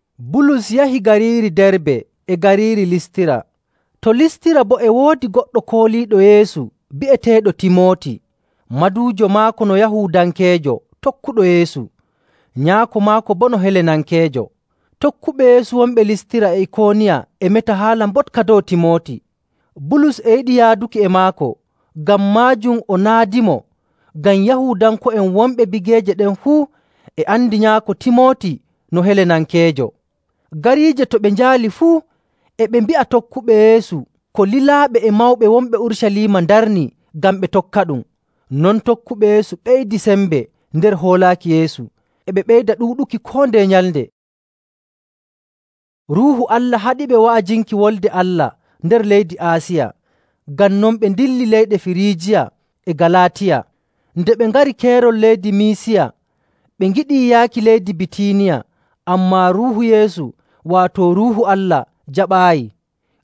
Bulus yahi gariiri Darbe e gariiri Listira. To Listira boo e woodi goɗɗo kooliiɗo Yeesu bi'eteeɗo Timooti. Maduujo maako no Yahuudankeejo tokkuɗo Yeesu, nyaako maako boo no Helenankeejo. Tokkuɓe Yeesu wonɓe Listira e Ikooniya e meta haala mboɗka dow Timooti. Bulus e yiɗi yaaduki e maako, ngam maajum o naadimo; ngam Yahuudanko'en wonɓe bigeeje ɗen fuu e andi nyaako Timooti no Helenankeejo. Gariije to ɓe njaali fuu, e ɓe mbi'a tokkuɓe Yeesu ko lilaaɓe e mawɓe wonɓe Urucaliima ndarni ngam ɓe tokkaɗum. Non tokkuɓe Yeesu ɓeydi sembe nder hoolaaki Yeesu, e ɓe ɓeyda ɗuuɗuki koo ndeye nyalnde. Ruuhu Allah haɗiɓe wa'ajinki Wolde Allah nder leydi Aasiya, ngam non ɓe ndilli leyɗe Firiijiya e Galaatiya. Nde ɓe ngari keerol leydi Miisiya, ɓe ngiɗii yaaki leydi Bitiiniya, ammaa Ruuhu Yeesu, waato Ruuhu Allah, jaɓaayi.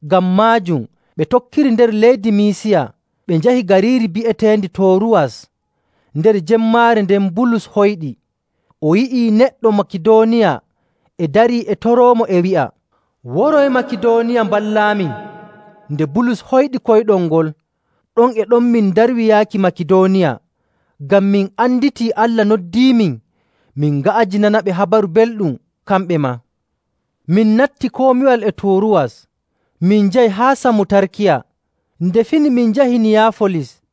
Ngam maajum, ɓe tokkiri nder leydi Miisiya, ɓe njahi gariiri bi'eteendi Tooruwas. Nder jemmaare nden Bulus hoyɗi. O yi'ii neɗɗo Makidooniya e darii e toroomo e wi'a, “Woroy Makidooniya, mballaamin!” Nde Bulus hoyɗi koyɗol ngol, ɗon e ɗon min ndarwi yaaki Makidooniya, ngam min anditii Allah noddiimin min nga'ajinanaɓe Habaru Belɗum kamɓe maa. Min natti komiwal e Tooruwas, min njahi haa Samutarkiya. Nde fini min njahi Niyaafolis.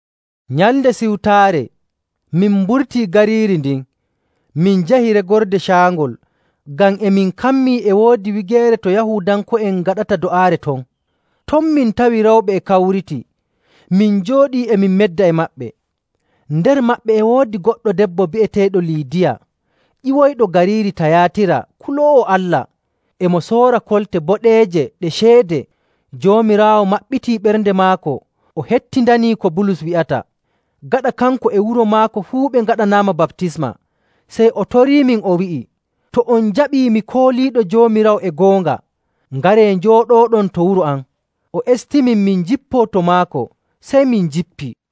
Nyalnde Siwtaare, min mburtii gariiri ndin min njahi regorde caangol, ngam e min kammii e woodi wigeere to Yahuudanko'en ngaɗata do'aare ton. Ton min tawi rewɓe e kawriti. Min njooɗii, e min medda e maɓɓe. Nder maɓɓe e woodi goɗɗo debbo bi'eteeɗo Liidiya, ƴiwoyɗo gariiri Tayaatira kuloowo Allah. E mo soora kolte boɗeeje ɗe ceede. Joomiraawo maɓɓiti ɓernde maako o hettindanii ko Bulus wi'ata. Gaɗa kanko e wuro maako fuu ɓe ngaɗanaama baptisma, sey o toriimin, o wi'i, “To on jaɓii mi kooliiɗo Joomiraawo e goonga, ngaree njooɗooɗon to wuro am.” O estimin min njippoo to maako, sey min njippii.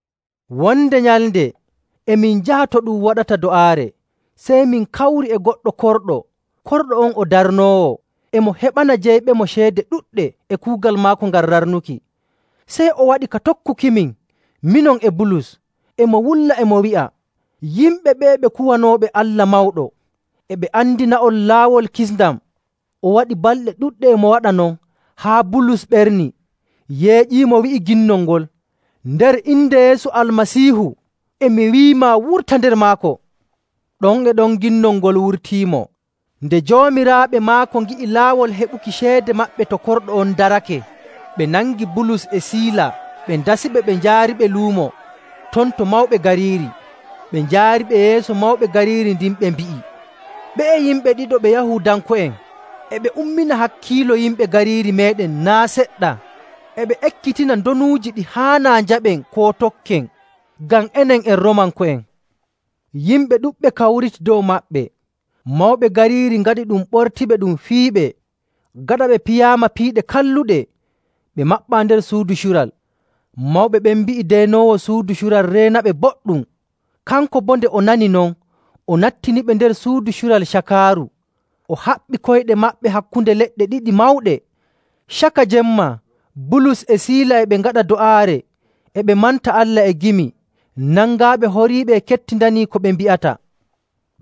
Wonde nyalnde e min njaha to ɗum waɗata do'aare, sey min kawri e goɗɗo korɗo. Korɗo on o darnoowo, e mo heɓana jeyɓemo ceede ɗuɗɗe e kuugal maako ngal rarnuki. Sey o waɗi ka tokkukimin, minon e Bulus, e mo wulla, e mo wi'a, “Yimɓe ɓe'e ɓe kuwanooɓe Allah Mawɗo! E ɓe andina'on laawol kisndam.” O waɗi balɗe ɗuɗɗe e mo waɗa non haa Bulus ɓerni, yeeƴiimo, wi'i ginnol ngol, “Nder inde Yeesu Almasiihu, e mi wi'imaa wurta nder maako!” Ɗon e ɗon ginnol ngol wurtiimo. Nde joomiraaɓe maako ngi'i laawol heɓuki ceede maɓɓe to korɗo on darake, ɓe nangi Bulus e Siila, ɓe ndasiɓe ɓe njaariiɓe luumo, ton to mawɓe gariiri. Ɓe njaariɓe yeeso mawɓe gariiri ndin, ɓe mbi'i, “Ɓe'e yimɓe ɗiɗo ɓe Yahuudanko'en, e ɓe ummina hakkiilo yimɓe gariiri meeɗen naa' seɗɗa. E ɓe ekkitina ndonuuji ɗi haanaa njaɓen koo tokken, ngam enen en Roomanko'en.” Yimɓe ɗuɗɓe kawriti dow maɓɓe. Mawɓe gariiri ngaɗi ɗum ɓortiɓe ɗum fiyiɓe. Gaɗa ɓe piyaama piiɗe kalluɗe, ɓe maɓɓaa nder suudu cural. Mawɓe ɓen mbi'i deenoowo suudu cural reenaɓe boɗɗum. Kanko boo, nde o nani non, o nattiniɓe nder suudu cural cakaaru, o haɓɓi koyɗe maɓɓe hakkunde leɗɗe ɗiɗi mawɗe. Caka jemma, Bulus e Siila e ɓe ngaɗa do'aare e ɓe manta Allah e gimi. Nangaaɓe horiiɓe e kettindanii ko ɓe mbi'ata.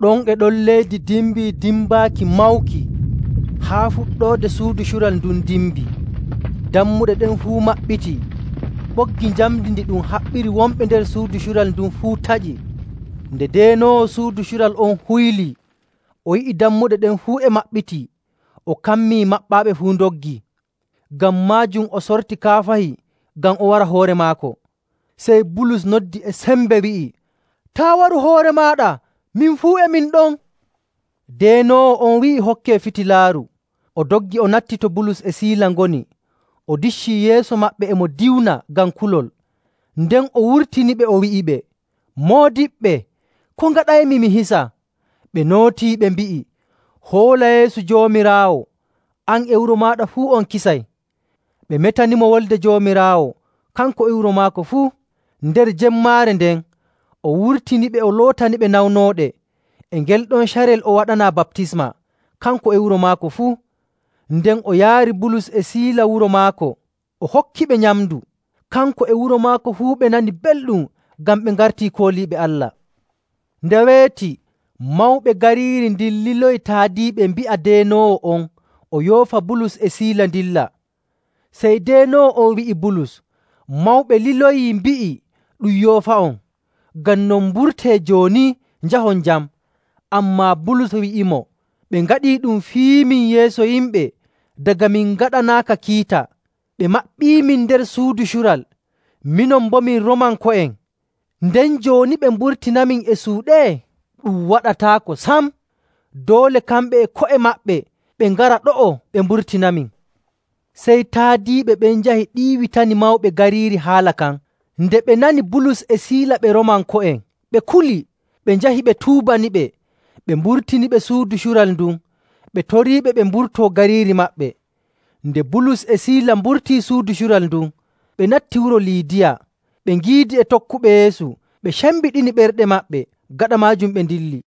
Ɗon e ɗon leydi dimbii dimbaaki mawki, haa fuɗɗoode suudu cural ndun dimbii. Dammuɗe ɗen fuu maɓɓitii, ɓoggi njamndi ɗi ɗum haɓɓiri wonɓe nder suudu cural ndun fuu taƴi. Nde deenoowo suudu cural on huylii, o yi'i dammuɗe ɗen fuu e maɓɓitii, o kammi maɓɓaaɓe fuu ndoggii. Ngam maajum o sorti kaafahi ngam o wara hoore maako. Sey Bulus noddi e sembe, wi'i, “Taa' waru hoore maaɗa. Min fuu e min ɗon!” Deenoowo on wi'i hokkee fitilaaru, o doggi o natti to Bulus e Siila ngoni, o diccii yeeso maɓɓe, e mo diwna ngam kulol. Nden o wurtiniɓe, o wi'iɓe, “Moodiɓɓe, ko ngaɗaymi mi hisa?” Ɓe nootii ɓe mbi'i, “Hoola Yeesu Joomiraawo, an e wuro maaɗa fuu, on kisay.” Ɓe metanimo Wolde Joomiraawo, kanko e wuro maako fuu. Nder jemmaare nden, o wurtiniɓe, o lootaniɓe nawnooɗe. E ngel ɗon carel o waɗanaa baptisma, kanko e wuro maako fuu. Nden o yaari Bulus e Siila wuro maako, o hokkiɓe nyamndu. Kanko e wuro maako fuu ɓe nani belɗum ngam ɓe ngartii kooliiɓe Allah. Nde weeti, mawɓe gariiri ndin liloyi taadiiɓe mbi'a deenoowo on o yoofa Bulus e Siila ndilla. Sey deenoowo on wi'i Bulus, “Mawɓe liloyii mbi'i ɗum yoofa'on. Ngam non mburtee jooni, njahon jam.” Ammaa Bulus wi'imo, “Ɓe ngaɗii ɗum fiyiimin yeeso yimɓe daga min ngaɗanaaka kiita, ɓe maɓɓiimin nder suudu cural. Minon boo, min Roomanko'en. Nden jooni ɓe mburtinamin e suuɗe? Ɗum waɗataako sam! Doole kamɓe e ko'e maɓɓe, ɓe ngara ɗo'o ɓe mburtinamin!” Sey taadiiɓe ɓen njahi ɗiiwitani mawɓe gariiri haala kan. Nde ɓe nani Bulus e Siila ɓe Roomanko'en, ɓe kuli. Ɓe njahi ɓe tuubaniɓe, ɓe mburtiniɓe suudu cural ndun. Ɓe toriiɓe ɓe mburtoo gariiri maɓɓe. Nde Bulus e Siila mburtii suudu cural ndun, ɓe natti wuro Liidiya. Ɓe ngiidi e tokkuɓe Yeesu, ɓe cembiɗini ɓerɗe maɓɓe. Gaɗa maajum ɓe ndilli.